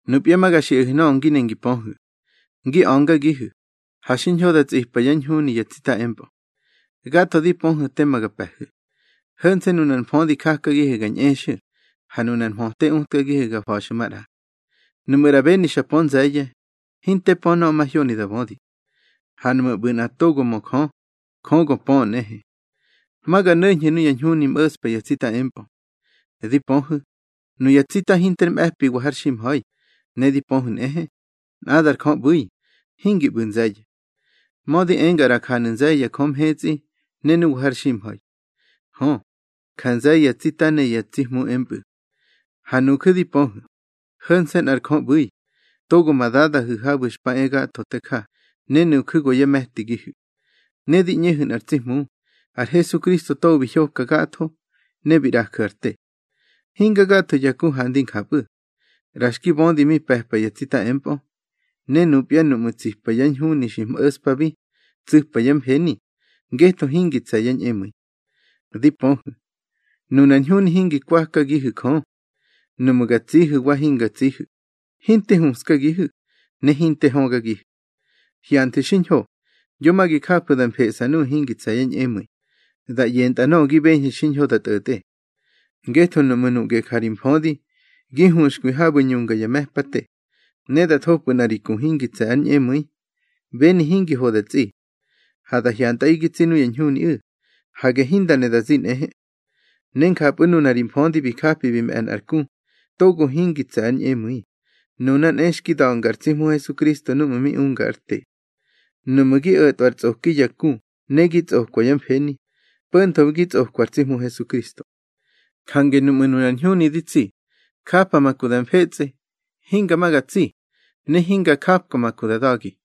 Nupya ma ga xiꞌahu̱ nöꞌö ngi ne gi pöhu̱: ngi a̱ngagihu̱, ha xiñho da tsꞌipa yá ñhuni ya tsita empꞌö. Gatho di pöhu̱ tema ga pe̱hu̱. Ho̱nse̱ nunar mfödi jakagihu̱ ga ñꞌexu̱, ha nunar mhöte utkagihu̱ ga fa̱xu̱ maꞌra. Nuꞌmu̱ ꞌra beni xa pö nze̱ye̱, hinte pö nöꞌö mahyoni da bödi. Ha nuꞌmu̱ ꞌbu̱ nꞌa togo mö Jö, Jö go pöꞌö nꞌehe. Ma ga no̱ñhu̱ nuya ñhuni mꞌo̱ꞌspa ya tsita empꞌö. Di pöhu̱, nuya tsita hinter mꞌe̱piwa har ximha̱i, ne di pöhu̱ nꞌehe, nꞌadar Jö ꞌbu̱i, hingi ꞌbu̱ nze̱ye̱. Mödi enga ꞌra janu̱ nze̱ye̱ ya jö mhetsꞌi ne nuwa har ximha̱i. Hö, ja nze̱ye̱ ya tsita ne ya tsi hmu empꞌu̱. Ha nuju̱ di pöhu̱, ho̱nse̱ nꞌar Jö ꞌbu̱i, togo ma Dadahu̱ habu̱ xpa e gatho te ja, ne nuju̱ go yá me̱tigihu̱. Ne di ꞌñehu̱ nꞌar tsi Hmu, ar Hesukristo togo bi hyoka gatho ne bi ꞌraju̱ ar te. Hinga gatho ya ku handi njapꞌu̱. ꞌRa xki bödi mi pe̱pa ya tsita empꞌö, ne nupya núꞌmu̱ tsipa yá ñhuni xi mꞌo̱ꞌspabi, tsu̱pa yá mfeni, ngetho hingi tse̱ yá ñꞌemu̱i. Di pöhu̱, nunar ñhuni hingi kwakagihu̱ Jö. Nuꞌmu̱ ga tsihu̱ wa hinga tsihu̱, hinte huꞌskagihu̱, ne hinte högagihu̱. Hyanthu̱ xiñho, yo ma gi jafu̱ da mfeꞌsa nuꞌu̱ hingi tse̱ yá ñꞌemu̱i, da ꞌyentꞌa nöꞌö gi beñhu̱ xiñho da tꞌo̱tꞌe. Ngetho nuꞌmu̱ nuꞌge ja ri mfödi gi huxkwi habu̱ ñunga ya me̱pate, ne da thopꞌu̱ nꞌa ri ku hingi tse̱ ár ñꞌemu̱i, beni hingi ho da tsꞌi. Ha da hyantꞌaꞌi gi tsi nuya ñhuniꞌu̱, hage hinda ne da zi nꞌehe. Ne njapꞌu̱ nuna ri mfödi bi japi bi mꞌe̱ nꞌar ku togo hingi tse̱ ár ñꞌemu̱i, nuna nꞌe xki da̱nga ar tsi Hmu Hesukristo núꞌmu̱ mi unga ár te. Nuꞌmu̱ gi o̱tꞌwa ar tsꞌoki ya ku ne gi tsꞌokwa yá mfeni, po̱ntho gi tsꞌokwa ar tsi Hmu Hesukristo. Jange nuꞌmu̱ nunar ñhuni di tsi, japa ma ku da mfetsꞌe, hinga ma ga tsi, ne hinga japka ma ku da da̱gi.